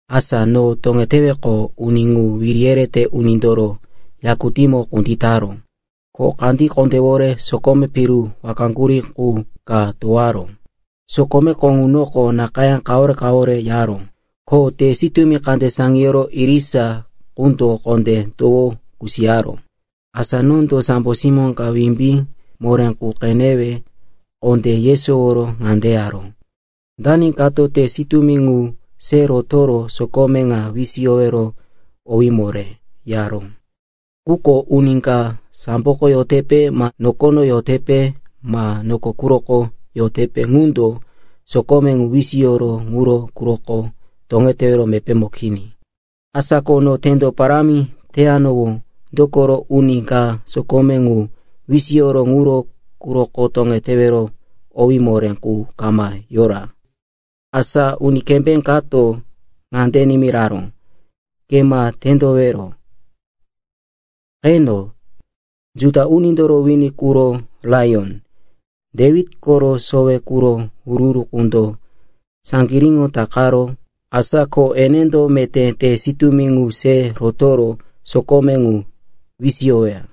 Asa no toŋeteweqo, uni ŋu wiri yerete unindoro yakutímo kunditaró, ko kandí kondéwore sokome piru wakaŋgurí qu ka towaró. Sokomeko ŋunoko nakayá kawore-kawore yaró, ko te sitúmi kande saŋiyoro irisa qundo kondé towo kusiyaró. Asa nondo sambo simó ka wimbí moré qu qenewe kondé yesoworo ŋande yaró, “Dani kato te sitúmi ŋu se rotoro sokome ŋa wisiyowero owí moré?” yaró. Quko uni ka samboko yotepe ma nokono yotepe ma noko quroko yote ŋundo sokome ŋu wisiyoro ŋuro quroko toŋetewero mepémo kini. Asa ko no tendo parámi teyanowó, dokoro uni ka sokome ŋu wisiyoro ŋuro quroko toŋetewero owí moré qu kama yora. Asa uni kembé kato ŋande nimiraró, “Ke ma tendowero. Qeno, Juda unindoro wini quro Laiyon, Dewit koro sowe quro Hurí qundo saŋgiríŋo takaró, asa ko enendo meté te sitúmi ŋu se rotoro sokome ŋu wisiyoweya.”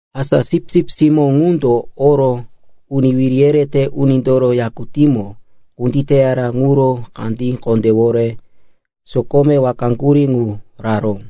Asa Sipsip Simó ŋundo oro uni wiri yerete unindoro yakutímo kunditeyara ŋuro kandí kondéwore sokome wakaŋgurí ŋu raró.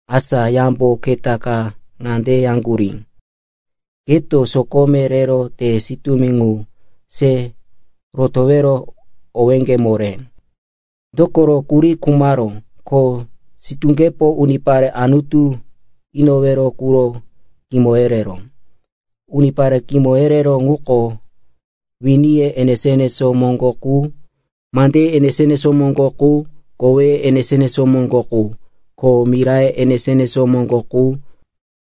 Asa yambo keta ka ŋande yaŋgurí, “Keto sokome rero te sitúmi ŋu se rotowero owéŋge moré. Dokoro, kuri khumaró, ko sitúŋgepo unipare Anutu inowero quro kimo yereró. Unipare kimo yereró ŋuko winiye enesó-enesó moŋgo qu, mandeye enesó-enesó moŋgo qu, koweye enesó-enesó moŋgo qu, ko miraye enesó-enesó moŋgo qu.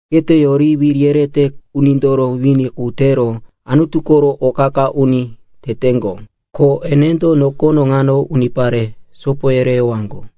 Keto yori wiri yerete unindoro wini qu tero Anutu koro o qa-qa uni teteŋgo. Ko enendo nokono ŋano unipare sopo yereyowaŋgo.”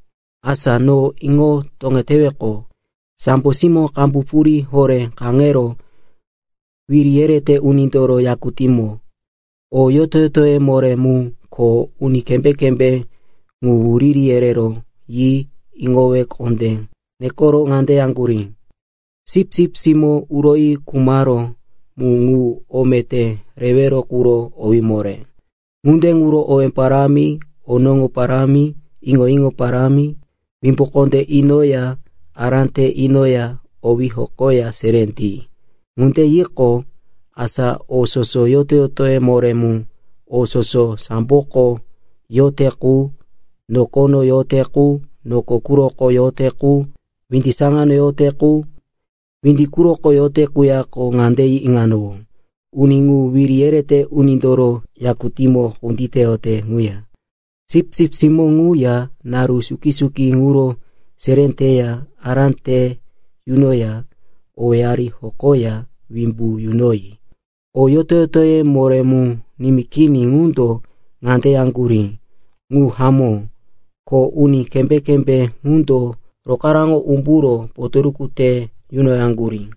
Asa no iŋo toŋeteweqo, sambo simó qambu purí horé kaŋero wiri yerete unindoro yakutímo, o yoto-yotoye moré mu ko uni kembé-kembé ŋu wuriri yerero yi iŋowe kondé nekero ŋande yaŋgurí, “Sipsip Simó uroyi khumaró mu ŋu o meté rewero quro owí moré. Ŋunde ŋuro owé parámi, onoŋo parámi, iŋo-iŋo parámi, wimbu kondé inoya ará te inoya owí hokoya seré ti!” Ŋunde yiqo, asa o soso yoto-yotoye moré mu: o soso samboko yote qu, nokono yote qu, noko quroko yote qu, windi saŋano yote qu, windi quroko yote quyako ŋande yi iŋanowó, “Uni ŋu wiri yerete unindoro yakutímo kunditeyote ŋuya, Sipsip Simó ŋu ŋuya, naru suki-suki ŋuro seré teya ará te yunoya owéyari hokoya wimbu yunoyi.” O yoto-yotoye moré mu nimí kini ŋundo ŋande yaŋgurí, “Ŋu hamó.” Ko uni kembé-kembé ŋundo rokaraŋo umburo potoruku te yunoyaŋgurí.